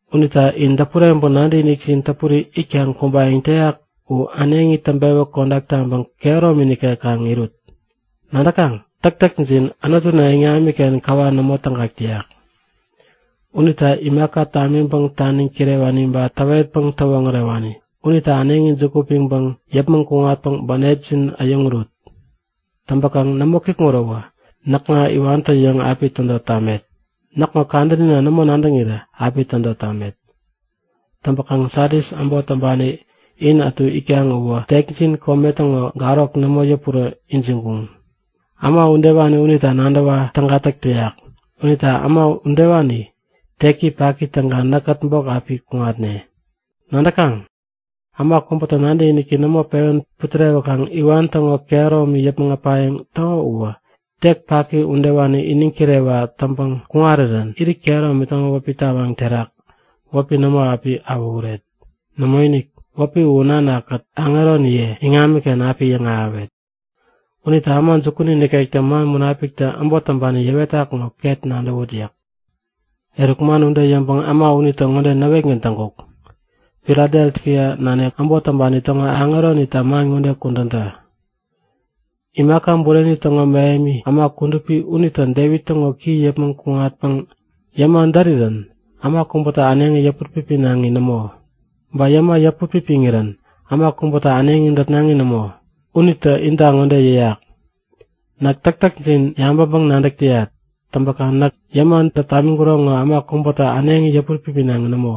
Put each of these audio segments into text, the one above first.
Unita in däpureŋpäŋ nadäkinikjin täpuri itkaŋ kumbayäŋ täyak u äneŋi täŋpewä kodak taŋpäŋ kehäromi nikek kaŋ irut. Nadäkaŋ? Täktäkjin Anutuna iŋamiken käwa nämo tägak täyak. Unita imaka tamiŋpäŋ taniŋ kirewani ba täwetpäŋ täwoŋärewani unita äneŋi juku piŋpäŋ yäpmäŋ kuŋatpäŋ bänepjin äyäŋurut. Täŋpäkaŋ nämo kikŋuräwä näkŋa iwantä-yäŋ api tädot tamet. Näkŋo kadänina nämo nadäŋirä api tädot tamet. Täŋpäkaŋ Sadis äbot täŋpani in ätu itkaŋ uwä tekjin kome täŋo garok nämo yäpurä ijiŋkuŋ. Äma udewani unita nadäwa täga täk täyak unita äma udewani tek paki täŋkaŋ näkkät bok api kuŋatne. Nadäkaŋ? Äma kubätä nadäkiniki nämo pewän putärewäkaŋ iwan täŋo kehäromi yäpmäŋ äpayäŋ täko uwä tek paki udewani iniŋ kirewa täŋpäŋ kuŋarirän irit kehäromi täŋo wäpi tawaŋ terak wäpi nämo api awähuret. Nämoinik, wäpi u Nana-kät aŋeroniye iŋamiken api yäŋahäwet. Unita äma jukuni nikektä man Munapiktä äbot täŋpani yäwetak ŋo ket nadäwut yäk. Eruk man ude yäŋpäŋ äma unitä ŋode näwetgän täŋkuk; Filadelfia nanik äbot täŋpani täŋo aŋeronita man ŋode kudän tä; Imaka bureni täŋo mähemi, äma kudupi unitä Devit täŋo ki yäpmäŋ kuŋatpäŋ yäma därirän äma kubätä äneŋi yäput-pipinaŋi nämo. Ba yäma yäput pipiŋirän äma kubätä äneŋi dätnaŋi nämo. Unitä inta ŋode yäyak; Näk täktäkjin yabäŋpäŋ-nadäk täyat. Täŋpäkaŋ näk yäma dät tamiŋkuro ŋo äma kubätä äneŋi yäput-pipinaŋi nämo.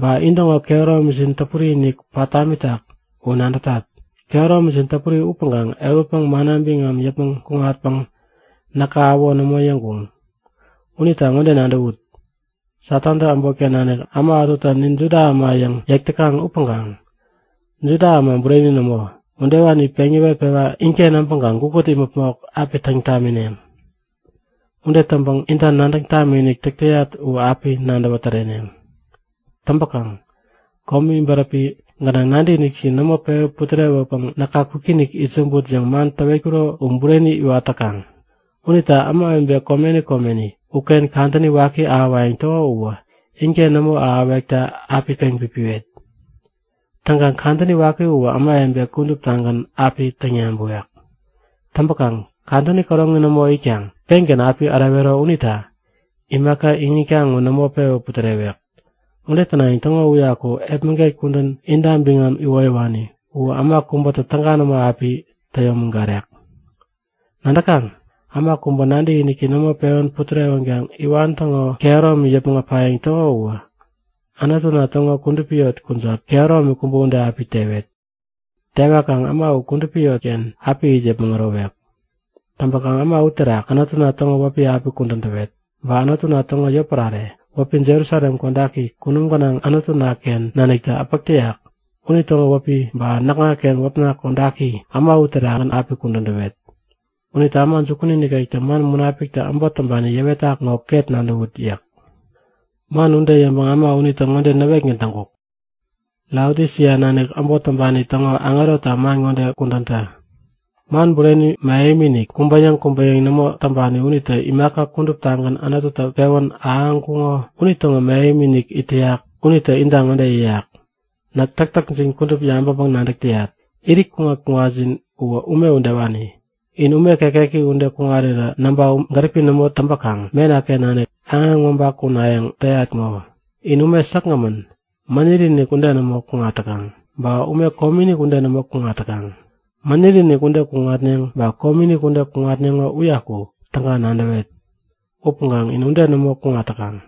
Ba intäŋo kehäromijin täpuri-inik pat tamitak u nadätat. Kehäromijin täpuri upäŋkaŋ ehutpäŋ manna biŋam yäpmäŋ kuŋatpäŋ näka äwo nämo yäŋkuŋ. Unita ŋode nadäwut; Satantä äbotken nanik äma ätutä Nin Juda äma yäŋ yäk täkaŋ upäŋkaŋ Juda äma bureni nämo, udewani peŋ yäwetpewa inken äbäŋkaŋ gukut imäpmok api täŋ tamineŋ. Ude täŋpäŋ inta nadäŋ tamikinik täk täyat u api nadäwä täreneŋ. Täŋpäkaŋ komi bäräpi gänaŋ nadäkinikjin nämo pewä putärewäpäŋ näka kwikinik itsämbut yäŋ man täwetkuro u bureni iwat täkaŋ. Unita ämawebe komeni komeni uken kadäni waki ahäwayäŋ täko uwä inken nämo ahäwekta api peŋpipiwet. Täŋkaŋ kadäni waki uwä ämawebe kuduptagän api täŋyabäwek. Täŋpäkaŋ kadäni käroŋi nämo itkaŋ pengän api ärewero unita imaka iŋitkaŋ u nämo pewä putärewek. Ude tänayäŋ täŋo uyaku epmäget kudän inta biŋam iwoyäwani u äma kubätä täga nämo api täyomägarek. Nadäkaŋ? Äma kubä nadäkiniki nämo pewän putärewänkaŋ iwan täŋo kehäromi yäpmäŋ äpayäŋ täko uwä Anutuna täŋo kudupi yot kujat kehäromi kubä ude api tewet. Tewakaŋ äma u kudupi yot uken api it yäpmäŋ ärowek. Täŋpäkaŋ äma uterak Anutuna täŋo wäpi api kudän täwet. Ba Anutuna täŋo yotpärare, wäpi Jerusalem Kodaki kunum gänaŋ Anutuna-ken nanik äpäk täyak unitäŋo wäpi, ba näkŋaken wäpna kodaki äma uterakgän api kudän täwet. Unita äma jukuni nikektä man Munapiktä äbot täŋpani yäwetak ŋo ket nadäwut yäk. Man ude yäŋpäŋ äma unitä ŋode näwetgän täŋkuk; Laodisia nanik äbot täŋpani täŋo aŋeronita man ŋode kudän tä; Man bureni mähemi-inik, kubä-yäŋ kubä-yäŋ nämo täŋpani unitä imaka kuduptagän Anututä pewän ahäŋkuŋo unitäŋo mähemi-inik it täyak. Unitä inta ŋode yäyak; Näk täktäkjin kudup yabäŋpäŋ-nadäk täyat. Irit kuŋat-kuŋatjin uwä ume udewani. In ume kekeki ude kuŋarirä näŋpa gäripi nämo täŋpäkaŋ mena-ken nanik aŋeŋ mäba-kunayäŋ täyat ŋo! In ume säkgämän, mäniri-inik ude nämo kuŋat täkaŋ, ba ume komiinik ude nämo kuŋat täkaŋ. Mäniri-inik ude kuŋatneŋ, ba komiinik ude kuŋatneŋo uyaku täga nadäwet. Upäŋkaŋ in ude nämo kuŋat täkaŋ!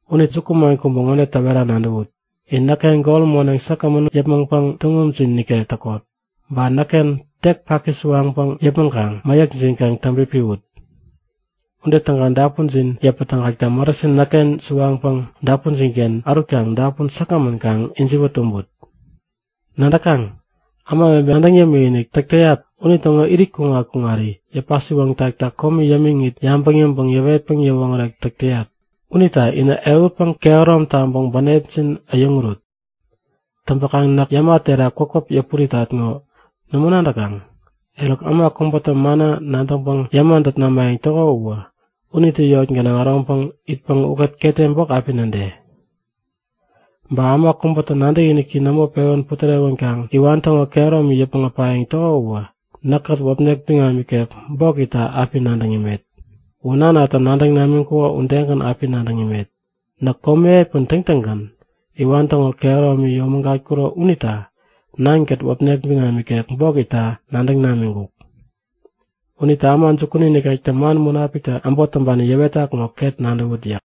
Unita jukuman kubä ŋode täwera nadäwut; In näkken gol moneŋ säkgämän u yäpmäŋpäŋ tuŋumjin nikek täkot. Ba näkken tek paki suwaŋpäŋ yäpmäŋkaŋ mäyäkjin kaŋ täŋpipiwut. Ude täŋkaŋ dapunjin yäpätägakta marasin näkken suwaŋpäŋ dapunjin-ken ärutkaŋ dapun säkgämän kaŋ ijiwä tumbut. Nadäkaŋ? Ämawebe nadäŋ yämikinik täk täyat unitäŋo irit kuŋat-kuŋari yäpä-siwoŋtakta komi yämiŋit, yabäŋ yäŋpäŋ yäwetpäŋ yäwoŋärek täk täyat. Unita inä ehutpäŋ kehärom taŋpäŋ bänepjin äyäŋurut. Täŋpäkaŋ näk yäma terak kwäpkwäp yäpuritat ŋo nämo nadäkaŋ? Eruk, äma kubätä manna nadäŋpäŋ yäma dät namayäŋ täko uwä, unitä yot gänaŋ äroŋpäŋ itpäŋ ukät ketem bok api näde. Ba äma kubä nadäkiniki nämo pewän putärewänkaŋ iwan täŋo kehäromi yäpmäŋ äpayäŋ täko uwä näkkät wäpnek biŋam ikek bok itta api nadäŋ imet. U nanatä nadäŋ namiŋkuko udegän api nadäŋ imet. Näk komi epän täŋtäŋgän iwan täŋo kehäromi yomägatkuro unita Nankät wäpnek biŋam ikek bok itta nadäŋ namiŋkuk. Unita äma jukuni nikektä man Munapiktä äbot täŋpani yäwetak ŋo ket nadäwut yäk.